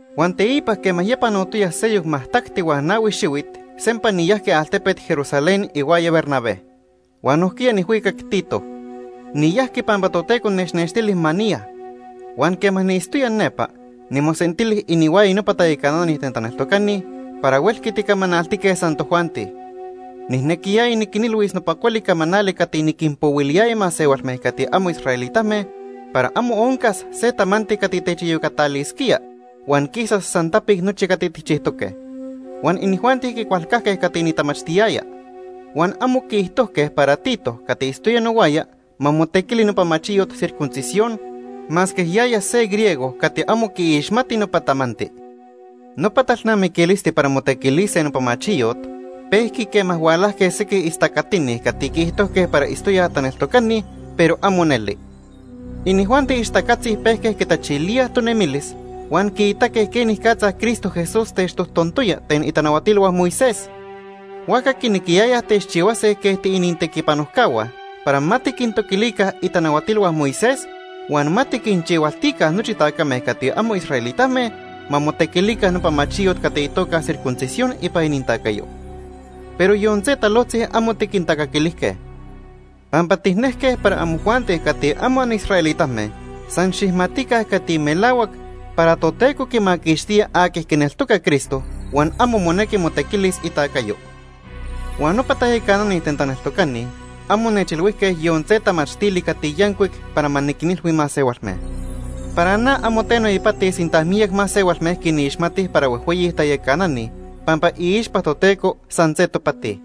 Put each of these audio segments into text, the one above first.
Huan teipa quema ya panotoya seyoc majtacti huan nahui xihuit, sempa niyajqui altepet Jerusalén ihuaya Bernabé. Huan nojquiya nijhuicac Tito. Niyajqui pampa Toteco nechnextili ma niya. Huan quema niitztoya nepa, nimosentili inihuaya nopa tayacanani ten taneltocani para huelqui ticamanaltique san tojuanti. Nijnequiyaya niquinilhuis nopa cuali camanali cati niquinpohuiliyaya masehualme cati amo israelitame para amo oncas se tamanti cati techiyocatalisquía huan quisas san tapic nochi cati tijchijtoque. Huan inijuanti quicualcajque cati nitamachtiyaya. Huan amo quiijtojque para Tito cati itztoya nohuaya ma motequili nopa machiyot circuncisión, masque yaya se griego cati amo quiixmati nopa tamanti. Nopa talnamiquilisti para motequilise nopa machiyot pejqui quema hualajque sequij istacatini cati quiijtojque para itztoyaj taneltocani, pero amo neli. Inijuanti ixtacatzi pejque quitachilíaj tonemilis huan quiitaque quenicatza Cristo Jesús techtojtontoya ten itanahuatilhua Moisés. Huajca quinequiyayaj techchihuase quej tiinintequipanojcahua para ma tiquintoquilica itanahuatilhua Moisés huan ma tiquinchihualtica nochi tacame cati amo israelitame ma motequilica nopa machiyot cati itoca circuncisión ipan inintacayo. Pero yon se talojtzi amo tiquintacaquilijque. Pampa tijnejque para amojuanti cati amo anisraelitame san xijmatica cati melahuac para Toteco quimaquixtía aqui quineltoca Cristo, huan amo monequi motequilis itacayo. Huan nopa tayacanani ten taneltocani amo nechilhuijque yon se tamachtili cati yancuic para ma niquinilhui masehualme. (Para na amo teno ipati sinta miyac masehualme quinixmatij para huejhueyi tayacanani, pampa iixpa Toteco san se topati.)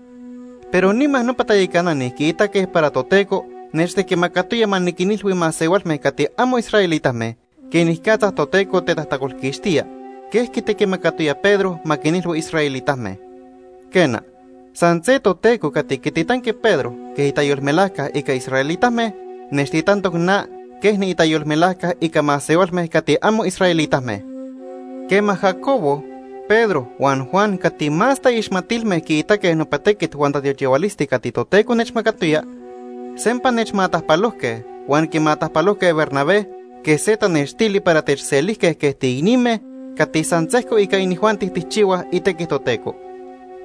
Pero nima nopa tayacanani quiitaque para Toteco nechtequimacatoya ma niquinilhui masehualme cati amo israelitame quenicatza Toteco tetajtacolquixtía, quej quitequimacatoya Pedro ma quinilhui israelitame. Quena, san se Toteco cati quititanqui Pedro quej itayolmelajca ica israelitame, nechtitantoc na quej niitayolmelajca ica masehualme cati amo israelitame. Quema Jacobo, Pedro huan Juan cati más taixmatilme quiitaque nopa tequit huan tatiochihualisti cati Toteco nechmacatoya, sempa nechmatajpalojque huan quimatajpalojque Bernabé quej se tanextili para techselijque quej tiicnime cati san sejco ica inijuanti tijchihuaj itequi Toteco.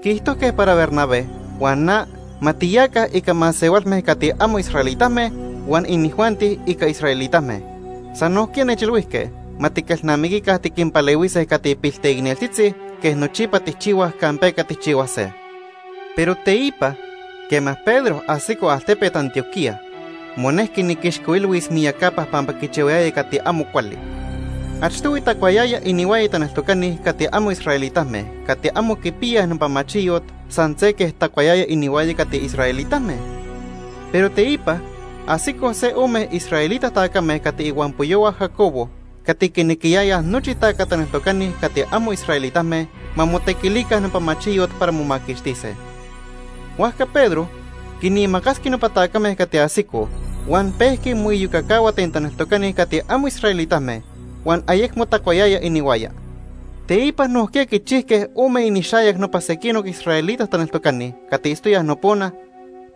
Quiijtojque para Bernabé huan na ma tiyaca ica masehualme cati amo israelitame huan inijuanti ica israelitame. San nojquiya nechilhuijque ma tiquelnamiquica tiquinpalehuise cati pilteicneltzitzi quej nochipa tijchihuaj campeca tijchihuase. Pero teipa, quema Pedro ajsico altepet Antioquía, monejqui niquixcoilhuis miyacapa pampa quichihuayaya cati amo cuali. Achtohui tacuayaya inihuaya taneltocani cati amo israelitame cati amo quipiyaj nopa machiyot san se quej tacuayaya inihuaya cati israelitame. Pero teipa, ajsicoj se ome israelita tacame cati ihuampoyohua Jacobo cati quinequiyayaj nochi taca taneltocani cati amo israelitame ma motequilica nopa machiyot para momaquixtise. Huajca Pedro quinimacasqui nopa tacame cati ajsicoj huan pejqui moiyocacahua ten taneltocani cati amo israelitame, huan ayecmo tacuayaya inihuaya. Teipa nojquiya quichijque ome inixayac nopa sequinoc israelita taneltocani cati itztoyaj nopona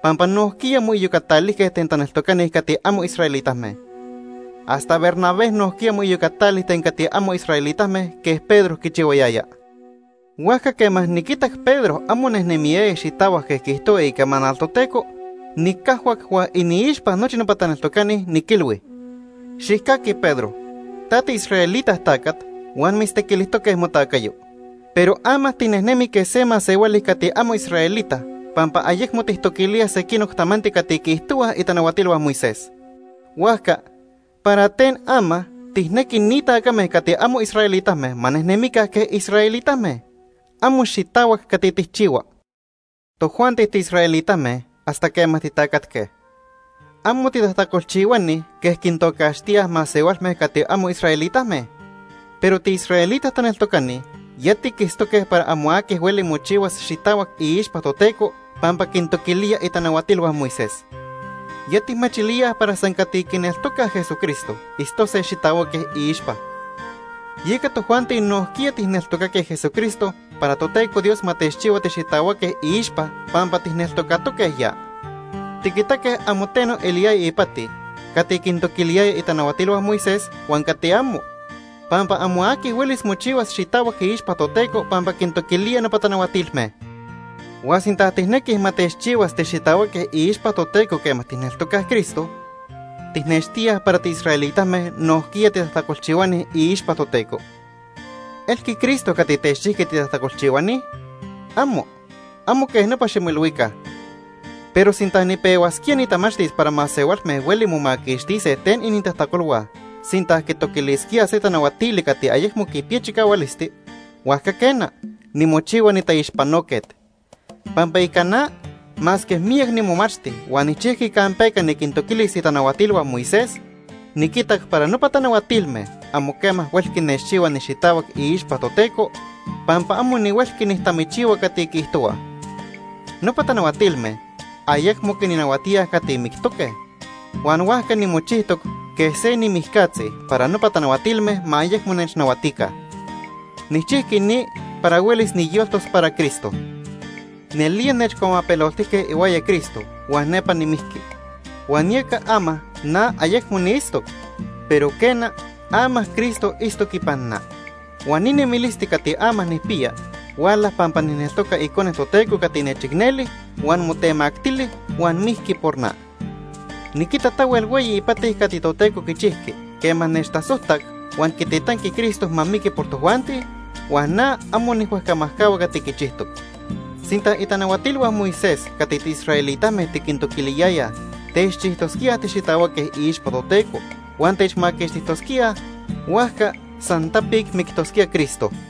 pampa nojquiya moiyocatalijque ten taneltocani cati amo israelitame. Hasta Bernabé nojquiya moiyocatali ten cati amo israelitame quej Pedro quichihuayaya. Huajca quema niquitac Pedro amo nejnemiyaya xitahuac quej quiijtohua icamanal Toteco, nicajhuac huan iniixpa nochi nopa taneltocani, niquilhui: “Xijcaqui Pedro, ta tiisraelita tacat huan mitztequilijtoque motacayo, pero ama tinejnemi quej se masehuali cati amo israelita pampa ayecmo tijtoquilía sequinoc tamanti cati quiijtohuaj itanahuatilhua Moisés. Huajca, ¿para ten ama tijnequi ni tacame cati amo israelitame ma nejnemica quej israelitame? Amo xitahuac cati tijchihua.” Tojuanti tiisraelitame hasta quema titacatque. Amo “titajtacolchihuani” quej quintocaxtíaj masehualme cati amo israelitame. Pero tiisraelita taneltocani ya tiquitztoque para amo aqui hueli mochihuas xitahuac iixpa Toteco pampa quintoquilía itanahuatilhua Moisés. Ya tijmachilíaj para san cati quineltocaj Jesucristo itztose xitahuaque iixpa. Yeca tojuanti nojquiya tijneltocaque Jesucristo para Toteco Dios ma techchihua tixitahuaque iixpa pampa tijneltocatoque ya. Tiquitaque amo teno eliyaya ipati cati quintoquiliyaya itanahuatilhua Moisés huan cati amo, pampa amo aqui huelis mochihuas xitahuac iixpa Toteco pampa quintoquilía nopa tanahuatilme. Huan sinta tijnequij ma techchihuas tixitahuaque iixpa Toteco quema tijneltocaj Cristo, tijnextíaj para tiisraelitame nojquiya titajtacolchihuani iixpa Toteco. ¿Elqui Cristo cati techchijqui titajtacolchihuani? ¡Amo! Amo quej nopa ximoilhuica. Pero sinta nipehuasquía nitamachtis para masehualme hueli momaquixtise ten inintajtacolhua sinta quitoquilisquíaj se tanahuatili cati ayecmo quipiya chicahualisti, huajca quena, nimochihua nitaixpanoquet. Pampa ica na, masque miyac nimomachti huan nijchijqui campeca niquintoquilis itanahuatilhua Moisés, niquitac para nopa tanahuatilme amo quema huelqui nechchihua nixitahuac iixpa Toteco, pampa amo nihuelqui nijtamichihua cati quiijtohuaj. Nopa tanahuatilme ayecmo quinnahuatíaj cati mictoque, huan huajca nimochijtoc quej se nimijcatzi para nopa tanahuatilme ma ayecmo nechnahuatica. Nijchijqui ni para huelis niyoltos para Cristo. Nelía nechcuamapeloltijque ihuaya Cristo huan nepa nimijqui. Huan yeca ama na ayecmo niitztoc, pero quena, ama Cristo itztoc ipan na. Huan ni nemilisti cati ama nijpiya huala pampa nijneltoca Icone Toteco cati nechicneli huan motemactili huan mijqui por na. Niquita tahuel hueyi ipati cati Toteco quichijqui quema techtasojtac huan quititanqui Cristo ma miqui por tojuanti, huan na amo nijhuejcamajcahua cati quichijtoc. Sinta itanahuatilhua Moisés cati tiisraelitame tiquintoquiliyayaj techchijtosquíaj tixitahuaque iixpa Toteco huan techmaquixtijtosquíaj, huajca san tapic mictosquía Cristo.